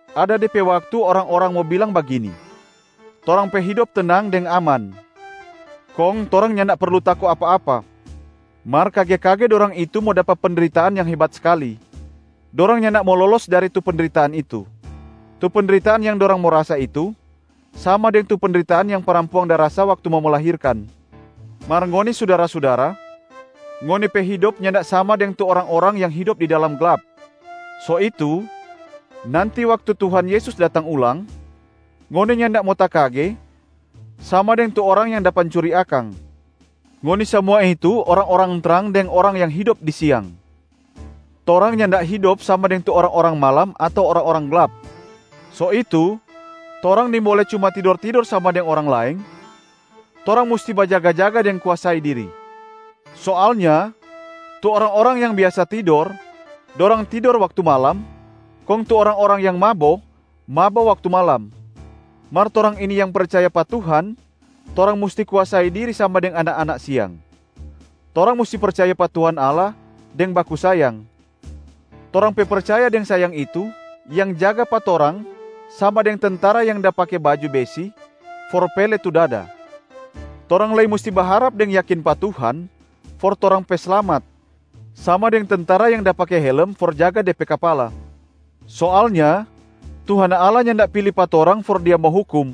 Ada de pe waktu orang-orang mo bilang bagini, “Torang pe hidop tenang deng aman, kong torang nyanda perlu tako apa-apa.” Mar kage-kage dorang itu mo dapa pendritaan yang hebat skali. Dorang nyanda mo lolos dari tu pendritaan itu. Tu pendritaan yang dorang mo rasa itu, sama deng tu pendritaan yang parampuang da rasa waktu mo melahirkan. Mar ngoni sudara-sudara, ngoni pe hidop nyanda sama deng tu orang-orang yang hidop di dalam glap. So itu nanti waktu Tuhan Yesus datang ulang, ngoni nyanda mo takage sama deng tu orang yang da pancuri akang. Ngoni samua itu orang-orang trang deng orang yang hidop di siang. Torang nyanda hidop sama deng tu orang-orang malam ato orang-orang glap. So itu torang nimbole cuma tidor-tidor sama deng orang laeng. Torang musti bajaga-jaga deng kuasai diri. Soalnya tu orang-orang yang biasa tidor, dorang tidor waktu malam, kong tu orang-orang yang mabo, mabo waktu malam. Mar torang ini yang percaya pa Tuhan, torang musti kuasai diri sama deng anak-anak siang. Torang musti percaya pa Tuhan Allah deng baku sayang. Torang pe percaya deng sayang itu yang jaga pa torang sama deng tentara yang da pake baju besi for pele tu dada. Torang lei musti baharap deng yakin pa Tuhan for torang pe slamat, sama deng tentara yang da pake helem for jaga de pe kapala. Soalnya Tuhan Allah nyanda pili pa torang for Dia mo hukum,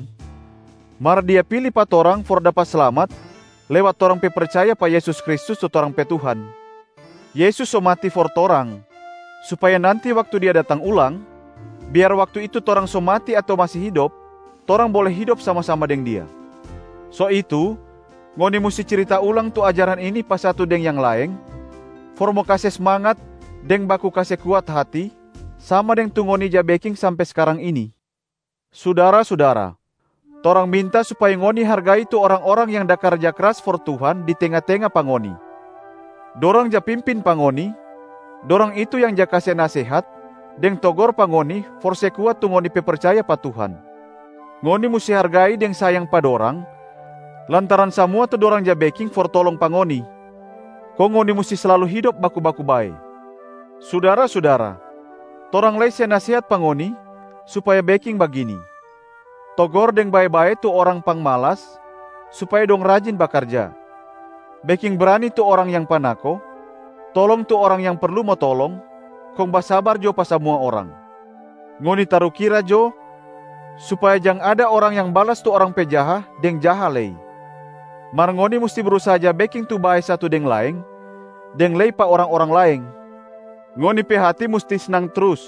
mar Dia pili pa torang for dapa slamat lewat torang pe percaya pa Yesus Kristus tu torang pe Tuhan. Yesus so mati for torang, supaya nanti waktu Dia datang ulang, biar waktu itu torang so mati ato masi hidop, torang bole hidop sama-sama deng Dia. So itu, ngoni musti cirita ulang tu ajaran ini pa satu deng yang laeng for mo kase smangat deng baku kase kuat hati, sama deng tu ngoni ja beking sampe skarang ini. Sudara-sudara, torang minta supaya ngoni hargai tu orang-orang yang da karja kras for Tuhan di tenga-tenga pa ngoni. Dorang ja pimpin pa ngoni, dorang itu yang ja kase nasehat deng togor pa ngoni for se kuat tu ngoni pe percaya pa Tuhan. Ngoni musti hargai deng sayang pa dorang lantaran samua tu dorang ja beking for tolong pa ngoni. Kong ngoni musti slalu hidop baku-baku bae. Sudara-sudara, torang lei se nasehat pa ngoni supaya beking bagini: togor deng bae-bae tu orang pangmalas supaya dong rajin bakarja, beking brani tu orang yang panako, tolong tu orang yang perlu mo tolong, kong basabar jo pa samua orang. Ngoni tarukira jo, supaya jang ada orang yang balas tu orang pe jaha deng jaha lei, mar ngoni musti brusaha ja beking tu bae satu deng laeng deng lei pa orang-orang laeng. Ngoni pe hati musti snang trus.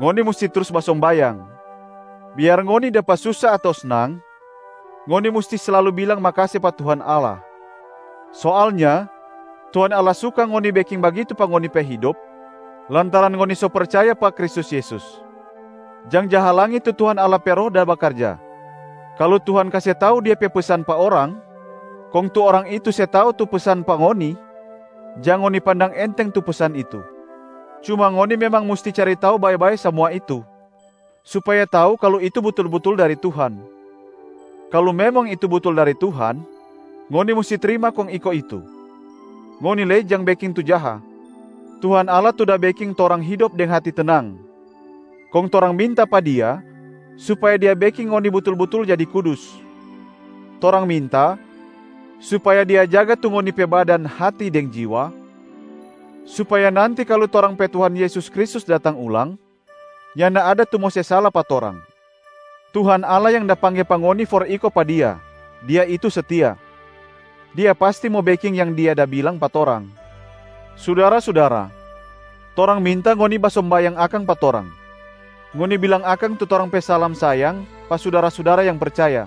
Ngoni musti trus basombayang. Biar ngoni dapa susa ato snang, ngoni musti slalu bilang makase pa Tuhan Allah. Soalnya Tuhan Allah suka ngoni beking bagitu pa ngoni pe hidop lantaran ngoni so percaya pa Kristus Yesus. Jang ja halangi tu Tuhan Allah pe Roh da bakarja. Kalu Tuhan kase tau Dia pe pesan pa orang kong tu orang itu se tau tu pesan pa ngoni, jang ngoni pandang enteng tu pesan itu. Cuma ngoni memang musti cari tau bae-bae samua itu supaya tau kalu itu butul-butul dari Tuhan. Kalu memang itu butul dari Tuhan, ngoni musti trima kong iko itu. Ngoni lei jang beking tu jaha. Tuhan Allah tu da beking torang hidop deng hati tenang, kong torang minta pa Dia supaya Dia beking ngoni butul-butul jadi kudus. Torang minta supaya Dia jaga tu ngoni pe badan, hati deng jiwa supaya nanti kalu torang pe Tuhan Yesus Kristus datang ulang, nyanda ada tu mo se sala pa torang. Tuhan Allah yang da pangge pa ngoni for iko pa Dia, Dia itu setia. Dia pasti mo beking yang Dia da bilang pa torang. Sudara-sudara, torang minta ngoni basombayang akang pa torang. Ngoni bilang akang tu torang pe salam sayang pa sudara-sudara yang percaya.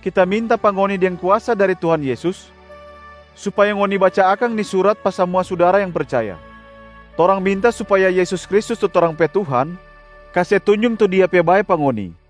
Kita minta pa ngoni deng kuasa dari Tuhan Yesus, supaya ngoni baca akang ni surat pa samua sudara yang percaya. Torang minta supaya Yesus Kristus tu torang pe Tuhan kase tunjung tu Dia pe bae pa ngoni.